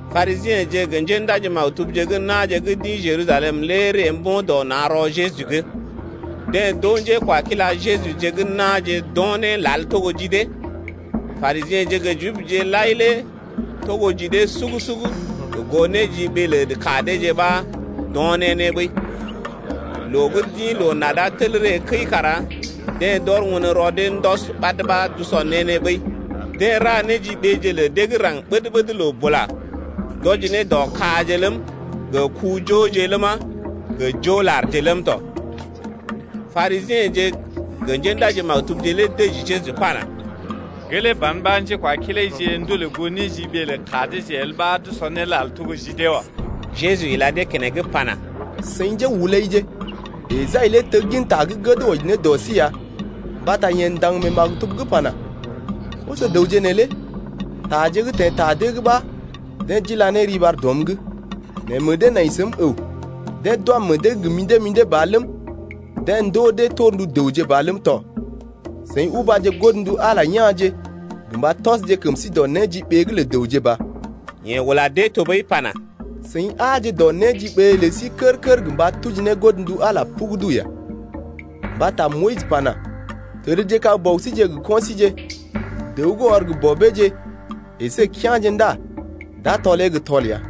Parisiḛje gə njéndaji-maktubje gə́ na̰je gə́ d’ḭ Jerusalem lé ree mbo̰ dɔ na̰ rɔ Jeju’g. Deḛ d’oo njékwakila Jejuje gə́ na̰je d’o̰ né lal togo ji dee. Parisiḛje gə Jibje lai lé togo ji dee sugu-sugu gə goo néjiɓee lə ka deeje lé ɓa d’o̰ ne né ɓəi. Loo gə́ d’ḭ loo-nada tel ree kəi kara deḛ d’ɔr won rɔ dee ndɔs ɓad ɓa d’usɔ ne né ɓəi. Deḛ ra néjiɓeje lə dee gə́ raŋg ɓəd-ɓəd loo bula, d’wɔji ne dɔ kaje ləm, gə ku-joje ləma, gə jo larje ləm tɔ. Parisiḛje gə njéndaji-maktubje lé dəji Jeju pana: Gelee ban ɓa njékwakilaije ndolè goo néjiɓee lə ka deeje el ɓa d’usɔ né lal togo ji dee wa. Jeju ila dee keneŋ pana: Seḭ njéhulaije, Esai lé teggin ta gə́ gəd wɔji ne dɔ sí ya mbata yeḛ ndaŋg mee maktub’g pana: Koso-dəwje neelé taje gə́ teḛ ta dee’g ɓa deḛ d’ila ne riɓar dɔm’g Nɛ meḛ dee nai səm əw. Deḛ d’wam meḛ dee gə mḭdé-mḭdé ba ləm, Deḛ ndoo dee torndu dəwje ba ləm tɔ. Seḭ ubaje godndu Ala ya̰je, gə mba tɔsje kəm sí dɔ néjiɓee’g lə dəwje ba. Yeḛ ula dee tɔɓəi pana: Seḭ aaje dɔ néjiɓee lə sí kər-kər gə mba tuji ne godndu Ala lé pugudu ya. Mbata Moyis pana: Təd kag bɔbije gə kɔinje, dəw gə́ ɔr gə bɔbeeje əsé kea̰je ndá d’a tɔlee gə́ tɔl ya.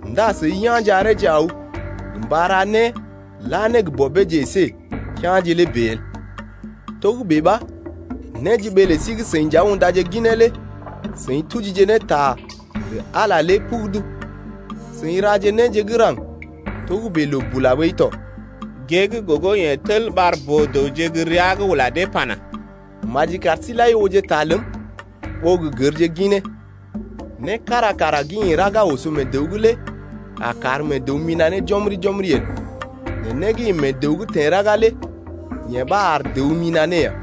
ndá seḭ yá̰je areeje aw gə mba ra né la ne gə bɔbeeje əsé gə kea̰je lé bèe el. Togə́bè ɓa néjiɓee lə sí gə́ seḭ nja undaje ginee lé seḭ tujije ne ta lə Ala lé pugudu. Seḭ raje néje gə́ raŋg togə́bè loo bula ɓəi tɔ. Gée gə́ gogo yeḛ tel ɓar boo-dəwje gə́ rəa’g ula dee pana: Maji kar sí-seḭje lai ooje ta ləm ɓó gə gərje ginee. Né kára kara gə́ ḭ raga oso mee dəw’g lé a kar mee dəw mina̰ ne jɔmri-jɔmri el, nɛ né gə́ ḭ mee dəw’g teḛ raga lé yee ɓa ar dəw mina̰ ne ya.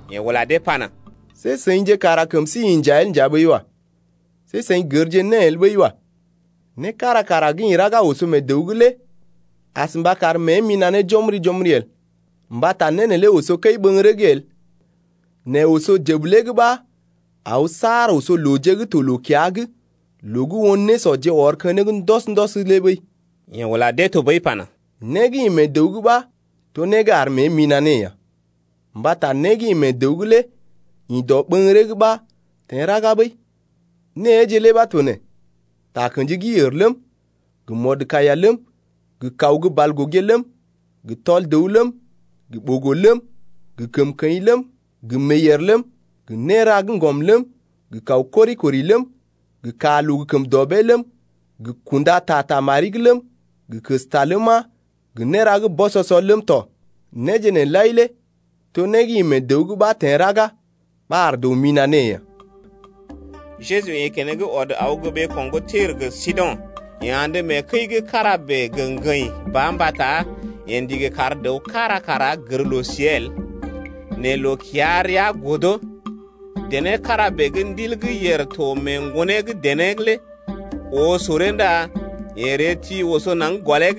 Yeḛ ula dee pana: See seḭje kara kəm sí inja el nja ɓəi wa. See seḭ gərje né el ɓəi wa. Né kára kara gə́ ḭ raga oso mee dəw’g lé as mba kar mée mina̰ ne jɔmri-jɔmri el. Mbata né neelé oso kəi-ɓə̰gəree’g el, nɛ oso jəbəlee’g ɓa aw saar oso looje gə́ to loo-kiya’g, loo gə́ won nésɔje ɔr keneŋ ndɔs-ndɔs lé ɓəi. Yeḛ ula dee tɔɓəi pana: Né gə́ ḭ mee dəw’g ɓa to né gə́ ar mée mina̰ ne ya. Mbata né gə́ ḭ mee dəw’g lé ḭ dɔɓəŋgəree’g ɓa teḛ raga ɓəi, néeje lé ɓa to nee, takə̰ji gə́ yèr ləm, gə mɔdkaiya ləm, gə kaw gə́ balgogé ləm, gə tɔl dəw ləm, gə ɓogo ləm, gə kəmkəḭ ləm, gə meeyèr ləm, gə néra gə́ ŋgɔm ləm, gə kaw kori-kori ləm, gə kaa loo gə kəm dɔbee ləm, gə kunda ta ta mari’g ləm, gə kəsta ləma, gə néra gə́ bɔsɔsɔ ləm tɔ. Néje nee lai lé to né gə́ ḭ mee dəw’g ɓa teḛ raga ɓa ar dəw mina̰ ne ya. Jeju ḭ keneŋ ɔd aw gə́ ɓeeko̰ gə́ Tir gə Sido̰. Yeḛ andə mee kəi’g kára bèe gə ŋgəḭ ba mbata yeḛ ndigi kar dəw kára kara gər loo-siée el, nɛ loo-kiya-rəa godo. Dené kára bèe gə́ ndil gə́ yèr to mee ŋgonee gə́ dené’g lé oo soree ndá yeḛ ree ti oso naŋg gɔlee’g.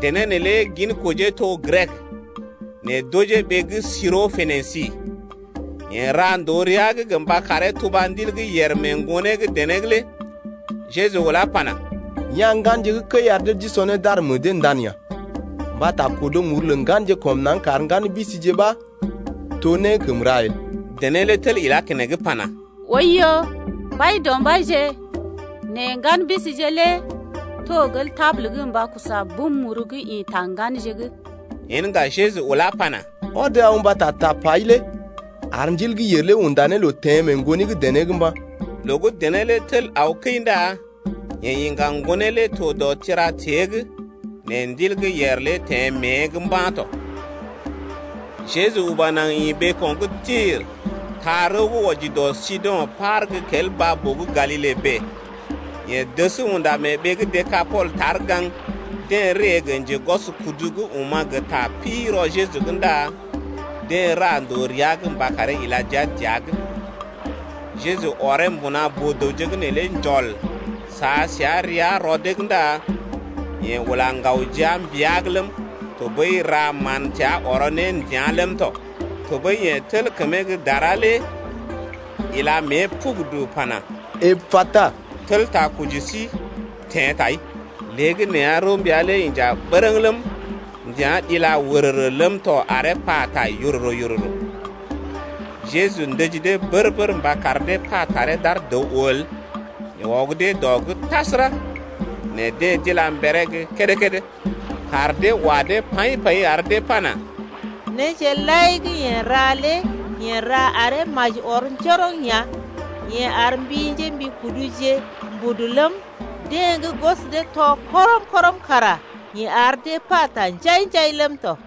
Dené neelé ginkojee to gə́ Grek, nɛ d’ojee ɓee gə́ Siro-Pénisi. Yeḛ ra ndòo rəa’g gə mba karee tuba ndil gə́ yèr mee ŋgonee gə́ dené’g lé. Jeju ulá pana: Ya̰ ŋganje gə́ kəi ar dee d’usɔ né d’ar meḛ dee ndan ya, mbata kodo muru lə ŋganje kɔm naŋg kar ŋgan bisije ɓa to né gə́ kəm ra el. Dené lé tel ilá keneŋ pana: Oiyo, Mbaidɔmbaije, nɛ ŋgan bisije lé to gel tabul’g mba sɔ bum muru gə́ ḭ ta ŋganje’g ya. Yen ŋga Jeju ulá pana: Ɔd aw mbata tapai lé ar ndil gə́ yèr unda ne loo mee ŋgoni gə́ dené’g teḛ mba̰ ya. Loo gə́ dené lé tel aw kəi ndá yeḛ iŋga ŋgonee lé dɔ tira-tée’g nɛ ndil gə́ yèr lé teḛ mée’g mba̰ tɔ. Jeju uba naŋg ḭ ɓeeko̰ gə́ Tir taa rəw gə́ wɔji dɔ Sido̰ par gə́ kel baa-boo gə́ Galile’g bèe, yeḛ dəs unda mee ɓee gə́ Dekapol tar gaŋg. Deḛ ree gə njegwɔskudu gə́ oma̰ gə ta pi rɔ Jeju’g ndá deḛ ra ndòo rəa’g mba karee ila jia dəa’g. Jeju ɔree mbuna boo-dəwje’g neelé njɔl, sa səa rəa rɔ dee’g ndá yeḛ ula ŋgaw jia mbia’g ləm, tɔɓəi ra mán təa ɔrɔ ne ndəa̰ ləm tɔ. Tɔɓəi yeḛ tel kəmee gə́ dara lé ila mée pugudu pana: Epata, (tel takɔji sí teḛ tai). Léegəneeya rəw mbia lé inja bərəŋ ləm, ndəa̰ dila wərərə ləm tɔ aree pata yororo-yororo. Jeju ndəji dee bər-bər mba kar dee pa taree d’ar dəw oo el, yeḛ ɔg dee dɔ’g tasəra, nɛ deḛ d’ila mberee gə́ kédé-kédé. Kaar dee wa dee paḭ-paḭ ar dee pana: Néje lai gə́ yeḛ ra lé yeḛ ra aree maji ɔr njoroŋ ya: Yeḛ ar mbi njémbikuduje mbudu ləm, deḛ gə́ gwɔs dee tɔ kɔrəm-kɔrəm kara yeḛ ar dee pata njai-njai ləm tɔ.